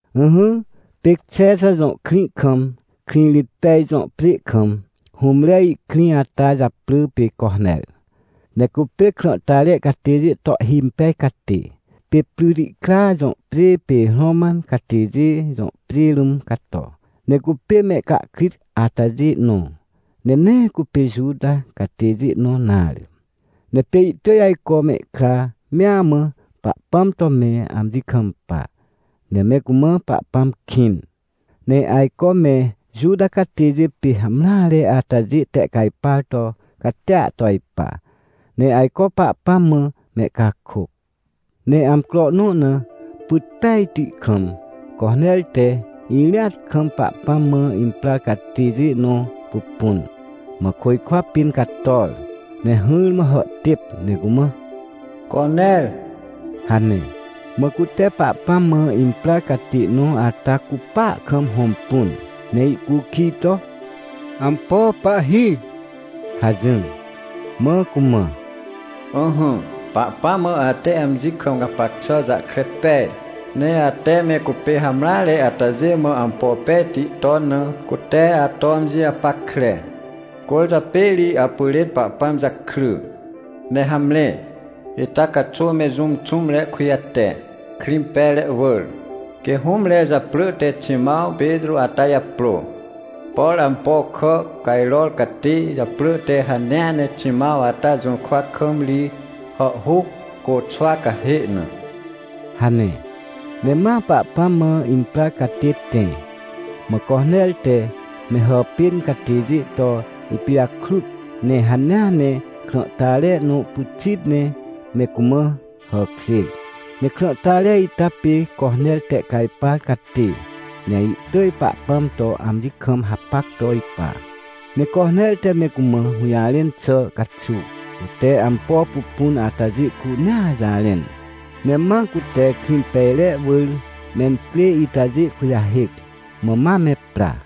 Ỹhỹ, pê Xexa jõ krĩ kam, Krĩrĩtpej jõ pjê kam, hũmre ihkrĩ ata japrỳ te Coner. Ne cupê krãhtare catêjê to ihhimpej catê. Pê Prytikra jõ pjê pê Roman catêjê jõ pjê rũm cato. Ne cupê mehcahkrit atajê nõ, ne nee cupê Juta catêjê nõ nare. Ne pê ihtỳj ajco mehkra mea mã, Pahpãm to me amji kampa, ne me cumã Pahpãm kĩn. Ne ajco me Juta catêjê pê hamreare atajê tehcajpar to catia to ipa, ne ajco Pahpãm mã mehcakôc. Ne amcro nõ na, pyt pejti kam, Coner te irĩat kam Pahpãm mã imprar catêjê nõ pupun, mã côjkwa pĩn cator ne hỹrmã hàhtêp ne cumã: — Coner — hane. Mã cute Pahpãm mã imprar catê nõ ata cupa kam hõmpun, ne ihcukij to: — Ampo, Pahhi? — hajỹr. Mã cumã: — Ỹhỹ, Pahpãm mã ate amji kam gapac xà jahkre pej, ne ate me cupê hamreare atajê mã ampo pejti ton na, cute ato amji japackre. Cwỳrjapê ri apyrên Pahpãm jakry. Ne hamre, ita caxuw me jũm xũmre kujate, Krĩmpejre wỳr, quê hũmre japrỳ te Ximãw Petrô ata japrô. Por ampo kà cajror catê japrỳ te hanea ne Ximãw ata jũrkwa kam ri hàhhuc, côxwa cahê na — hane. Ne ma Pahpãm mã imprar catê tẽ. Mã Coner te me hàpên catêjê to ipijakrut, ne hanea ne krãhtare nõ pyxit ne me cumã hàkjêr. Ne krãhtare ita pê Coner tehcajpar catê, ne ihtỳj Pahpãm to amji kam hapac to ipa. Ne Coner te me cumã hũjarẽn xà caxuw, cute ampo pupun atajê cunea jarẽn. Ne ma cute Krĩmpejre wỳr mencrê itajê kujahêc, mã ma me pra.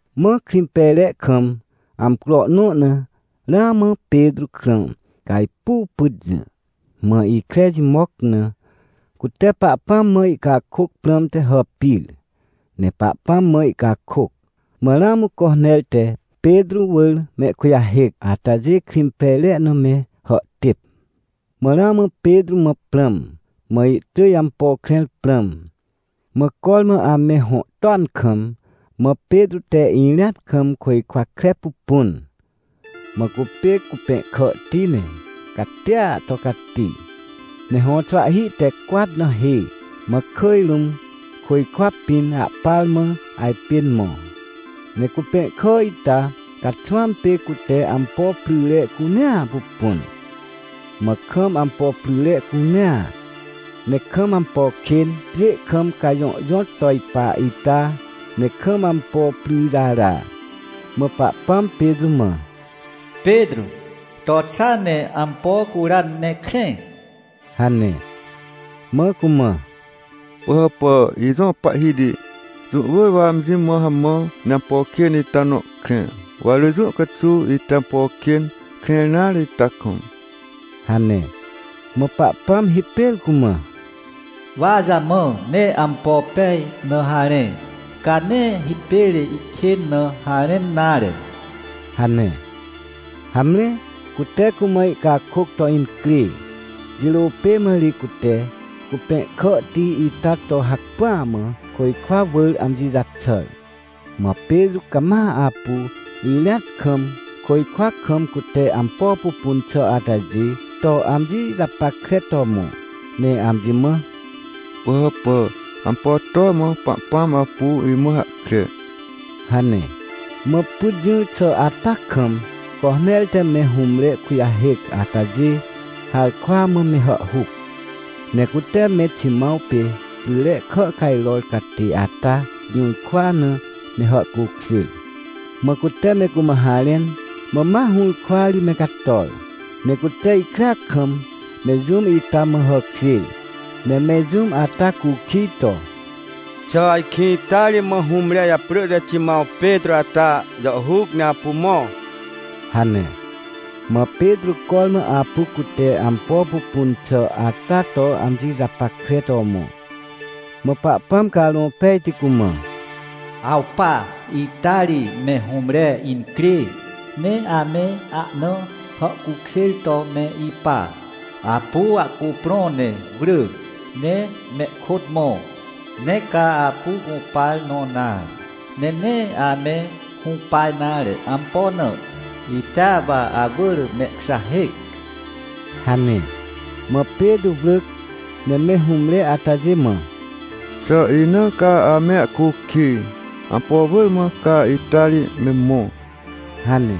Mã Krĩmpejre kam, amcro nõ na, ramã Petrô krã cajpuw pyt jỹ, mã ikre jimoc na, cute Pahpãm mã ihcakôc prãmte hàpir, ne Pahpãm mã ihcakôc. Mã ramã Coner te Petrô wỳr mehkujahêc atajê Krĩmpejre na me hàhtêp. Mã ramã Petrô mã prãm, mã ihtỳj ampo krẽr prãm. Mã cormã ame hõ toan kam, mã Petrô te irĩat kam côjkwa kre pupun. Mã cupê cupẽhkàhti, ne catia to cati, ne hõxwahhi te cwat na hê, mã kỳj rũm, côjkwa pĩn ahpar mã ajpên mõ. Ne cupẽhkà ita caxwãm pê cute ampo pryre cunea pupun. Mã kam ampo pryre cunea, ne kam ampo kên pjê kam cajõhjõt to ipa ita, ne kam ampo pryjara. Mã Pahpãm Petrô mã: — Petrô, to xa ne ampo cura, ne krẽ — hane. Mã cumã: — Pỳhàpà, ijõ Pahhiti! Jũ wỳr wa amji mã hamã ne ampo kên ita nõ krẽ. Wa rỳ jũ caxuw ite ampo kên krẽr nare ita kam — hane. Mã Pahpãm hipêr cumã: — Wa jamã ne ampo pej na harẽ, ca nee hipêr ihkên na harẽn nare — hane. Hamre, cute cumã ihcakôc to incrê. Jirô pê mã ri cute cupẽhkàhti ita to hacpỹa mã côjkwa wỳr amji jaxàr. Mã Petrô cama apu irĩat kam, côjkwa kam cute ampo pupun xà atajê to amji japackre to mõ, ne amji mã: — Pỳhàpà, ampo to mã Pahpãm apu imã hahkre? — hane. Mã pyt jỹr xà ata kam, Coner te me hũmre kujahêc atajê harkwa mã me hàhhuc. Ne cute me Ximãw pê pryre kà cajror catê ata jũrkwa na me hàhcukjêr. Mã cute me cumã harẽn, mã ma hũrkwa ri me cator, ne cute ikrea kam, me jũm ita mã hàkjêr, ne me jũm ata cukij to: — Xà ajkĩ ita ri mã hũmre japrỳ te Ximãw Petrô ata jàhhuc ne apu mõ? — hane. Mã Petrô cormã apu cute ampo pupun xà ata to amji japackre to mõ. Mã Pahpãm Carõ Pejti cumã: — Awpa! Ita ri me hũmre incrê, ne ame ana hàhcukjêr to me ipa. Apu ahcuprõ ne wrỳ, ne mehkôt mõ. Nee ca apu gũpar nõ nare, ne nee ame hũpa nare. Ampo na? Itea wa awỳr mehkujahêc — hane. Mã Petrô wrỳc, ne me hũmre atajê mã: — Xà ina ca ame ahcukij? Ampo wỳr mã ca ita ri me mõ? — hane.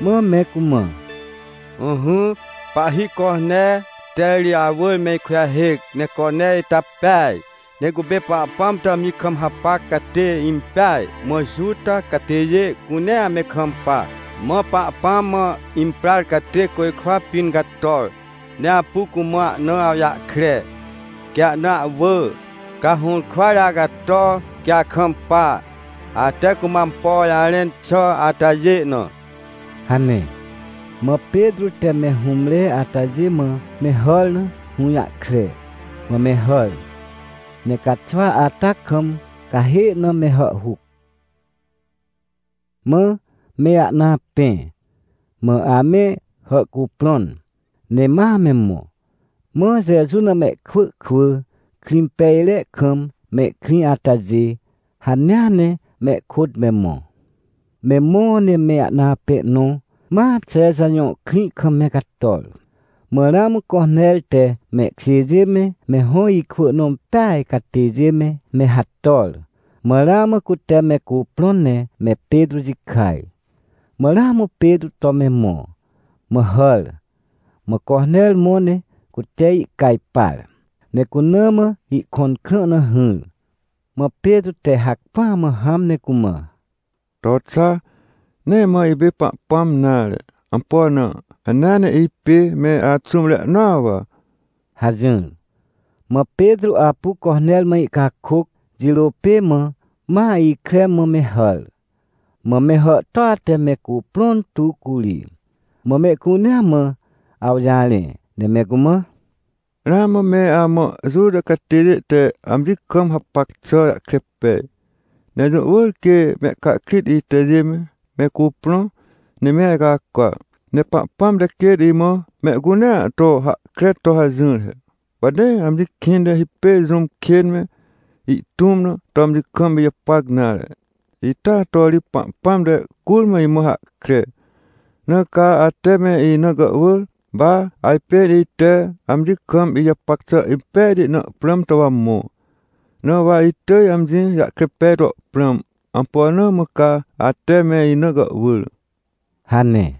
Mã me cumã: — Ỹhỹ, pahhi Coner te ri awỳr me ikujahêc. Ne Coner ita peaj, ne cupê Pahpãm to amji kam hapac catê impeaj, mã Juta catêjê cunea me kampa. Mã Pahpãm mã imprar catê côjkwa pĩn cator, ne apu cumã ana awjahkre, quê ana ahwỳ, ca hũrkwa ri acato, quê akampa, ate cumã ampo jarẽn xà atajê na — hane. Mã Petrô te me hũmre atajê mã me hàr na hũjahkre, mã me hàr, ne caxwa ata kam cahê na me hàhhuc. Mã me ahna apẽ, mã ame hàhcuprõn, ne ma me mõ. Mã Jeju na mehkwỳ kwỳ, Krĩmpejre kam mehkrĩ atajê, hanea ne mehkôt me mõ. Me mõ ne me ahna apẽ nõ ma Xexa jõ krĩ kam me cator. Mã ramã Coner te mehkjêjê me, me hõ ikwỳ nõ peaj catêjê me, me hator, mã ramã cute me cuprõn ne me Petrô jikaj. Mã ramã Petrô to me mõ, mã hàr, mã Coner mõ ne cute ihcajpar, ne cuna mã ihkõn krã na hỹr. Mã Petrô te hacpỹa mã hãm ne cumã: — To xa, nee mã ipê Pahpãm nare. Ampo na? Hanea ne ipê me axũmre nõa wa — hajỹr. Mã Petrô apu Coner mã ihcakôc jirô pê mã, ma ikre mã me hàr. Mã me hàhtôa te me cuprõn tu curi. Mã mehcunea mã awjarẽ, ne me cumã: — Ramã me amã Juta catêjê te amji kam hapac xà jahkre pej. Ne jũ wỳr quê mehcahkrit itajê me, me cuprõ ne me ajcacwa. Ne Pahpãm te quêt imã mehcunea to hahkre to hajỹr he, wa nee amji kĩnte hipêr jũm kên me, ihtũm na, to amji kam ijapac nare. Ita to ri Pahpãm te curmã imã hahkre. Na ca ate me ina gàhwỳr, wa ajpên ite amji kam ijapac xà impejti na prãm to wa mõ. Na wa itỳj amji jahkre pej to prãm, ampo na mã ca ate me ina gàhwỳr? — hane.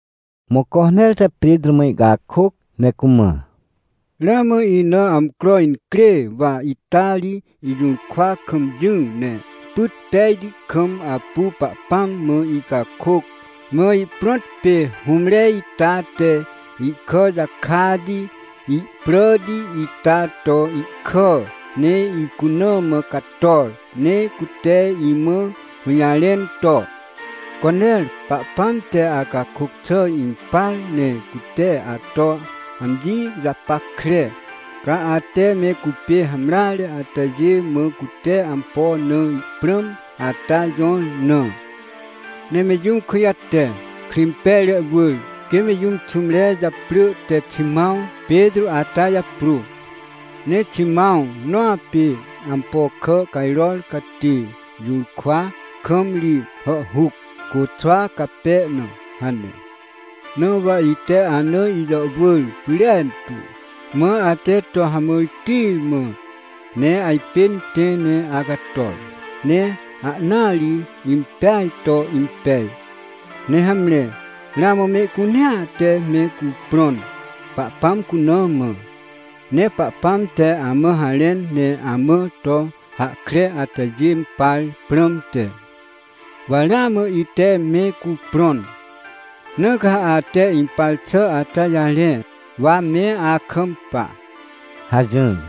Mã Coner te Petrô mã ihcakôc, ne cumã: — Ramã ina amcro incrê, wa ita ri ijũrkwa kam jỹ, ne pyt pejti kam apu Pahpãm mã icakôc. Mã ihprõt pê hũmre ita te ihkà jakati ihpràti ita to ihkà, ne icuna mã cator, ne cute imã hũjarẽn to: — “Coner, Pahpãm te acakôc xà impar, ne cute ato amji japackre, ca ate me cupê hamreare atajê mã cute ampo na ihprãm ata jõr na. Ne me jũm kujate, Krĩmpejre wỳr, quê me jũm xũmre japrỳ te Ximãw Petrô ata japrô. Ne Ximãw nõ apê ampo kà cajror catê jũrkwa kam ri hàhhuc, côxwa cape na” hane. Na wa ite ana ijàhwỳr pyrentu. Mã ate to hamãrti mã, ne ajpên tẽ ne acator, ne ahnaa ri impeaj to impej. Ne hamre, ramã mehcunea te me cuprõn, Pahpãm cuna mã. Ne Pahpãm te amã harẽn ne amã to hahkre atajê par prãmte, wa ramã ite me cuprõn. Na ca ha ate impar xà ata jarẽ, wa me akampa — hajỹr.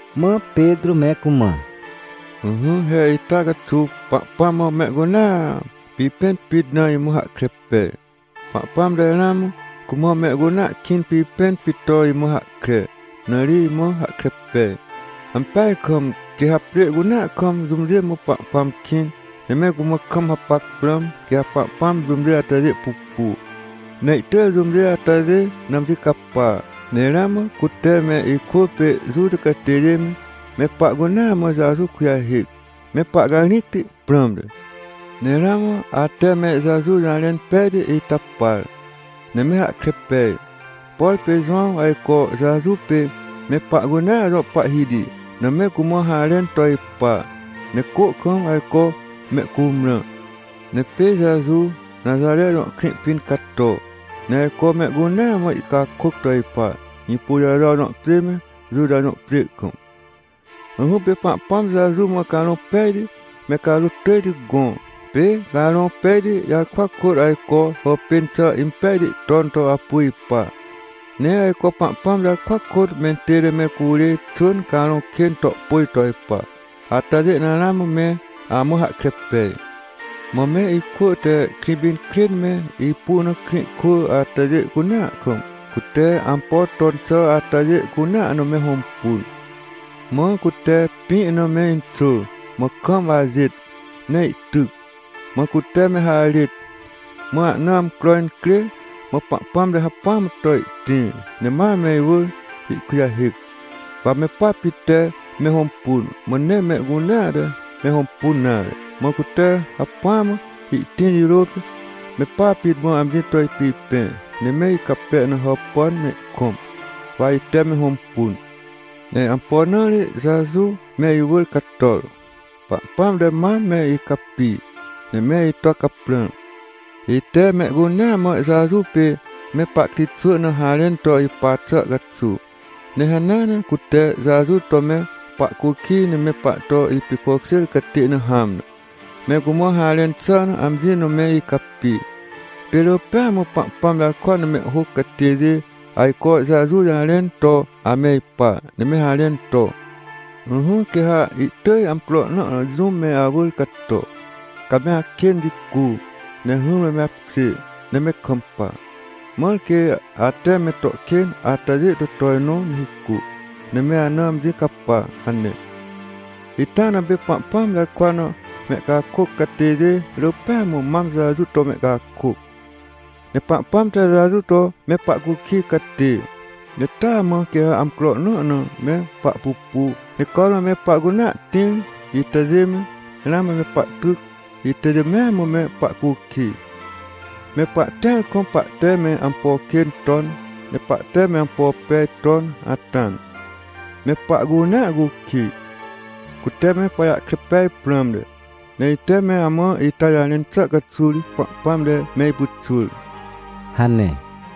Mã Petrô me cumã: — Ỹhỹ, he ita caxuw Pahpãm mã mehcunea pipẽn pit na imã hahkre pej. Pahpãm te ramã cumã mehcunea kĩn pipẽn pit to imã hahkre, na ri imã hahkre pej. Ampeaj kam, quê ha pjê cunea kam jũmjê mã Pahpãm kĩn, ne me cumã kam hapac prãm, quê ha Pahpãm jũmjê atajê pupu, ne ihtỳj jũmjê atajê na amji capa. Ne ramã cute me ikwỳ pê Juta catêjê me, me pahcunea mã Jeju kujahêc, me pahcarĩcti prãmte. Ne ramã ate me Jeju jarẽn pejti ita par, ne me hahkre pej, por pê Jowãw ajco Jeju pê me pahcunea jõ Pahhiti na me cumã harẽn to ipa, ne cô kam ajco mehcumrã. Ne pê Jeju Naxare jõ krĩ pĩn cato, ne ajco mehcunea mã ihcakôc to ipa, Hĩpôjajo jõ pjê me, Juta jõ pjê kam. Ỹhỹ, pê Pahpãm Jeju mã Carõ Pejti me carôt tỳjti gõ. Pê Carõ Pejti jarkwa kôt ajco hàpên xà impejti ton to apu ipa. Ne ajco Pahpãm jarkwa kôt mentête me curê xwỳn carõ kên to pôj to ipa. Atajê na ramã me amã hahkre pej. — Mã me ikwỳ te Krĩpinkrên me ipu na krĩ kwỳ atajê cunea kam, cute ampo ton xà atajê cunea na me hõmpun. Mã cute pĩ na me inxôr, mã kam ajêt, ne ihtyc. Mã cute me harêt, mã ahna amcro incrê, mã Pahpãm te hacpỹa mã to ihtĩr, ne ma me iwỳr ihkujahêc. Wa me pa pit te me hõmpun, mã nee mehcunea te me hõmpun nare. Mã cute hacpỹa mã ihtĩr jirô pê me pa pit mã amji to ipipẽ, ne me icape na hàpàn ne ihkõm, wa ite me hõmpun. Ne ampo na ri Jeju me iwỳr cator? Pahpãm te mam me icapi, ne me ito caprãr, ite mehcunea mã Jeju pê me pahkritxwỳ na harẽn to ipa xà caxuw. Ne hanea ne cute Jeju to me pahcukij ne me pahto ipicokjêr catê na hãm na, me cumã harẽn xà na amji na me icapi. Pê rỳ pêa mã Pahpãm jarkwa na mehhôc catêjê ajco Jeju jarẽn to ame ipa, ne me harẽn to: “Ỹhỹ, quê ha ihtỳj amcro nõ na jũm me awỳr cato. Ca me akên jicu, ne hỹrmã me apkjê, ne me kampa, mãr quê ate me to kên atajê to tojnõ ne hicu, ne me ana amji capa” hane. — Ita na pê Pahpãm jarkwa na mehcakôc catêjê rỳ pêa mã mam Jeju to mehcakôc. Ne Pahpãm te Jeju to me pahcukij catê. Ne taa mã quê ha amcro nõ na me pahpupu ne cormã me pahcunea tĩr itajê me, ramã me pahtyc itajê mea mã me pahcukij. Me pahtĩar kam, pahte me ampo kên ton, ne pahte me ampo pej ton ata na, me pahcunea cukij, cute me pajahkre pej prãmte. Ne ite me amã ita jarẽn xà caxuw ri Pahpãm te me ipyxwỳr — hane.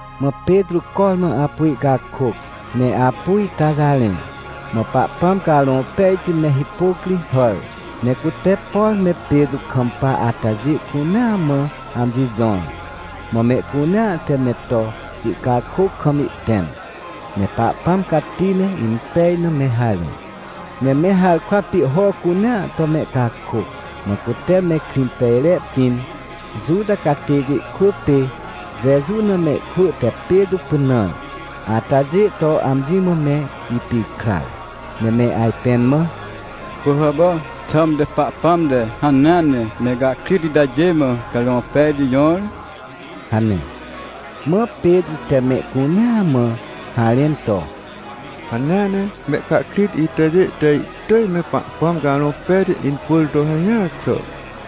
Mã Petrô cormã apu ihcakôc, ne apu ita jarẽ, mã Pahpãm Carõ Pejti me hipôc ri hàr. Ne cute, por me Petrô kam hapac atajê cunea mã amji jõr. Mã mehcunea te me to ihcakôc kam ihtẽm. Ne Pahpãm cati ne impej na me harẽ. Ne me harkwa pihho cunea to mehcakôc. Mã cute me Krĩmpejre pĩn, Juta catêjê kwỳ pê Jeju na mehkwỳ te Petrô pynãr atajê to amji mã me ipikrar. Ne me ajpẽn mã: — Pỳhàpà, xãmte Pahpãm te hanea ne mehcahkrit itajê mã Carõ Pejti jõr? — hane. Mã Petrô te mehcunea mã harẽn to: — Hanea ne mehcahkrit itajê te ihtỳj me Pahpãm Carõ Pejti incwỳr to hajỹar xà,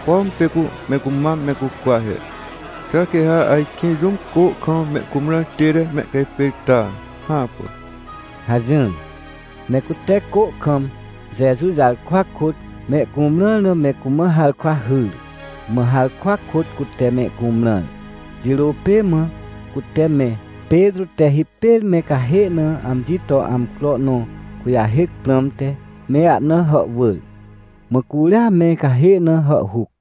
pom pê cu me cumam me cucwa he. Xà quê ha ajkĩ jũm cô kam me cumrãr tête mehcahpêrta? Hãpà! — hajỹr. Ne cute cô kam, Jeju jarkwa kôt, mehcumrãr na me cumã harkwa hyr. Mã harkwa kôt cute mehcumrãr. Jirô pê mã cute me, Petrô te hipêr me cahê na amji to amcro nõ kujahêc prãmte, me ahna hàhwỳr. Mã curia me cahê na hàhhuc.